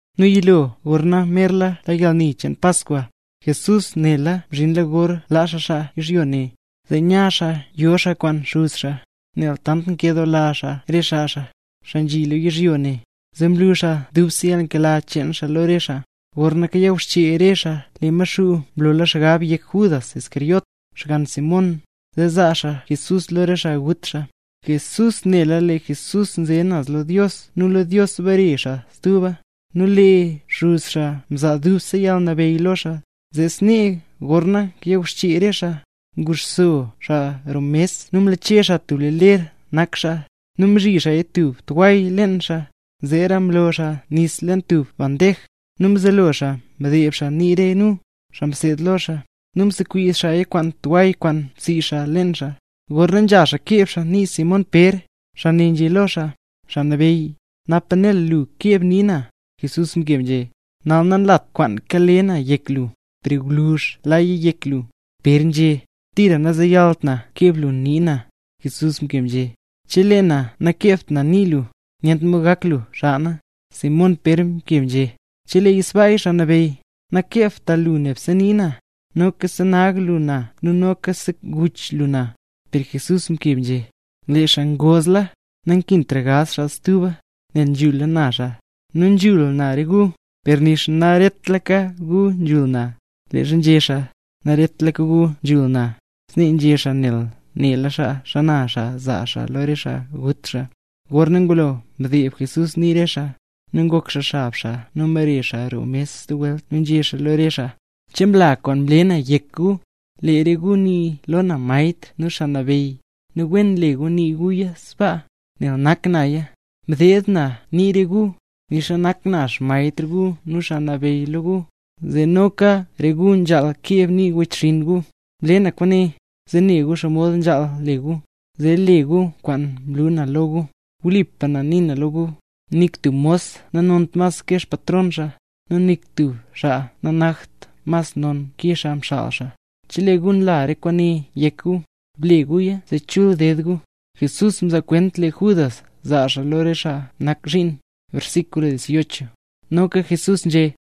Nu yilo gorna merla la yalni cheen Paskwa, Jesús nela mzhinla gor laa xaa yizhyo ne, zee nya xaa yo xaa kwaan Xuz xaa. Nel tant nkedoola xaa re xaa xaa, xaa nzhi lo yizhyo ne, zee mlu xaa dubse yalnkela cheen xaa lo re xaa. Gorna kayawxchee re xaa, lee Maxuu mlola xgab yek Judas Iscariote, xgann Simón, zee zaa xaa Jesús lo re xaa gut xaa. Jesús nela lee Jesús nze naz lo Dios nu lo Dios bare xaa stuba; nu lee Xuz xaa mzaa dubse yalnabeyy lo xaa. Zee snee gorna kayawxchee re xaa, nguxso xaa roo mes nu mlache xaa tub ler nak xaa, nu mzhi xaa tub tway leen xaa. Zeera mlo xaa nis leen tub bandej, nu mzelo xaa mdeeb xaa nii re nu, xaa mseed lo xaa, nu nsekwizh xaaya kwaan tway kwaan mzhi xaa leen xaa. Gorna nzha xaa keeb xaa nii Simón Pér, xaa ne nzhé lo xaa: —Xaa Nabeyy, ¿napa nel lu keeb nii na? Jesús mkeb nzhé: —Nal nanlat kwaan kale na yek lu, per gwluzh laya yek lu. Pér nzhé: —¡Tira nazeyalt na keeb lu nii na! Jesús mkeb nzhé: —Chelee na nakeebt na nii lu, nyent mod gak lu xaa na. Simón Pér mkeb nzhé: —¡Cheleeya sbaaya, Xaa Nabeyy, nakeebta lu nebse nii na, noka bsenag na nu noka bseguch na! Per Jesús mkeb nzhé: —Lee xaa ngozla, nankintra gaz xaa stuba, nel nzhula na xaa. Nu nzhul na re gu, per nixa naretlaka gu nzhul na. Leezha nzhé xaa: “Naretlaka gu nzhul na”, snee nzhé xaa nel nela xaa xana xaa zaa xaa lo re xaa gut xaa. Gorna ngulo mdeeb Jesús nii re xaa, nu ngok xaa xab xaa nu mbare xaa roo mes stub welt nu nzhé xaa lo re xaa: —¿Che mla kwaan mle na yek gu? Lee re gu nii lo na Maestr nu Xaa Nabeyy, nu wen nle gu nii guya sbaa, nel nak naya. Mdeeb na nii re gu, nixa nak na Xmaestr gu nu Xaa Nabeyy lo gu, zee noka re gu nzhaal keeb nii wechxinn gu. Mle na kwaane, zee ne gu xomod nzhaal le gu, zee le gu kwaan mlu na lo gu. Wlipa na nii na lo gu, nik tub mos nanont mas ke xpatron xaa, nu nik tub xaa nanakt mas non ke xaa mxaal xaa. Chelee gu nla re kwaane yek gu, ble guya zee chul ded gu. Jesús nzaa kwent lee Judas zaa xaa lo xaa nak zhiin Noka Jesús nzhé: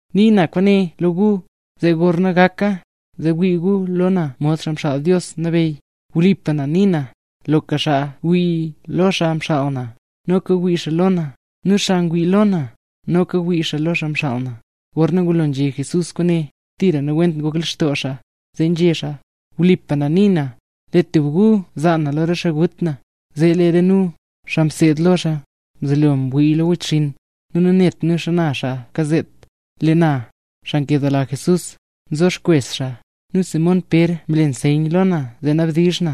Nii na kwaane lo gu, zee gorna gaka, zee wii gu lo na mod Xaa Mxaal Dios Nabeyy. Wlipa na nii na, loka xaa wii lo xaa mxaal na, noka ngwii xaa lo na, nu xaa ngwii lo na, noka ngwii xaa lo xaa mxaal na. Gorna ngulo nzhé Jesús kwaane, tira nawent ngok lextoo xaa, zee nzhé xaa: —Wlipa na nii na, lee tub gu zaa na lo re xaa gut na. Zee lee re nu, xaa mseed lo xaa, mzelo mwii lo wechxinn, nu nanet nu xana xaa kazet. Lee na, xaa nkedoola Jesús, nzo xkwes xaa, nu Simón Pér mle nseyn lo na zee nabdizh na,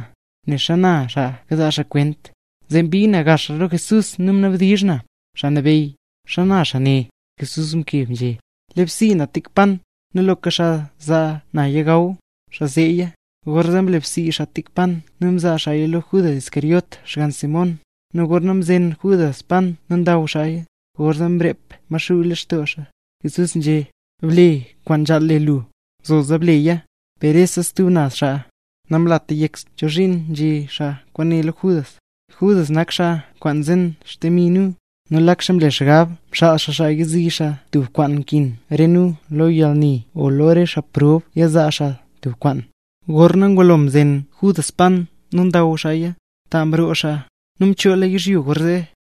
ne xana xaa kazaa xaa kwent. Zee mbii na gaxra lo Jesús, nu mnabdizh na: —Xaa Nabeyy, ¿xana xaa ne? Jesús mkeb nzhé: —Lebsii na tik pan, nu loka xaa za naya gaw, xaa zeeya. Gorzee mlebsii xaa tik pan nu mzaa xaaya lo Judas Iscariote, xgann Simón. Nu gorna mzen Judas pan nu ndaw xaaya, gorzee mzeeb Maxuu lextoo xaa. Jesús nzhé: —Ble kwaan nzhaal le lu, zoza leya. Per rese stub naz xaa, namlata yek chozhiin nzhé xaa kwaane lo Judas. Judas nak xaa kwaan nzen xdemi re nu, nu lak xaa mle xgab, mxaal xaa xaa yazii xaa tub kwaan nkin re nu lo yalni o lo re xaa prob nyazaa xaa tub kwaan. Gorna ngulo mzen Judas pan nu ndaw xaaya, ta mroo xaa. Nu mchoola yizhyo gorzee.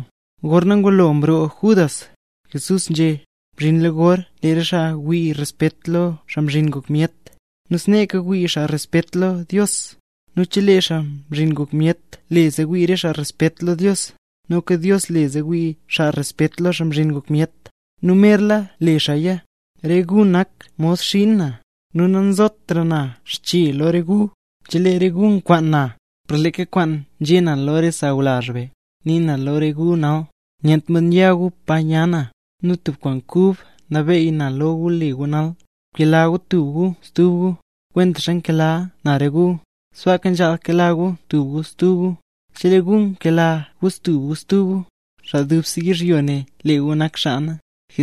Gorna ngulo mroo Judas, Jesús né: —Mzhinla gor lee re xaa wii respet lo na, Xaa Mzhin Ngok Myet, nu sneeka wii xaa respet lo Dios. Nu chelee na le zee wii re xaa respet lo Dios, noka Dios le zee wii re xaa respet lo na, Xaa Mzhin Ngok Myet; nu merla le xaaya. Re gu nak mod xiin na, nu nanzotra na xche lo re gu. Zee lee re gu kwaan na, per leeka kwaan nzhé na lo re xaa sawlazh be, nii na lo re gu nal, nyent mod ya gu pa nya na. Nu tub kwaan kub nabeey na lo gu le gu nal: Bkela gu tub gu stub gu, kwentaxa nkela na re gu, sbaaka nzhaal kela gu tub gu stub gu. Chelee gu kela gu tub gu stub gu, xaa dubse yizhyo ne lee gu nak xaa na.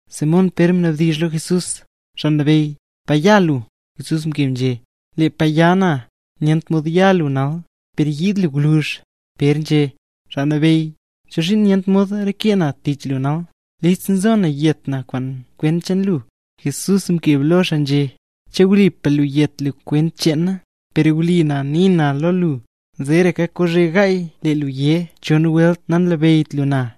Simón Pér mnabdizh lo Jesús: —Xaa Nabeyy, ¿pa nya lu? Jesús mkeb nzhé: —Lee pa nya na, nyent mod ya lu nal, per yiid lu gwluzh. Pér nzhé: —Xaa Nabeyy, ¿chozhiin nyent mod reke na tich lu nal? ¡Listla nzo na yet na kwent cheen lu! Jesús mkeb lo xaa nzhé: —¿Che wlipa lu yet lu kwent cheen na? Per wli na nii na lo lu, zeeraka kozhe gaay lee lu yé chon welt nanlabeyyt lu na.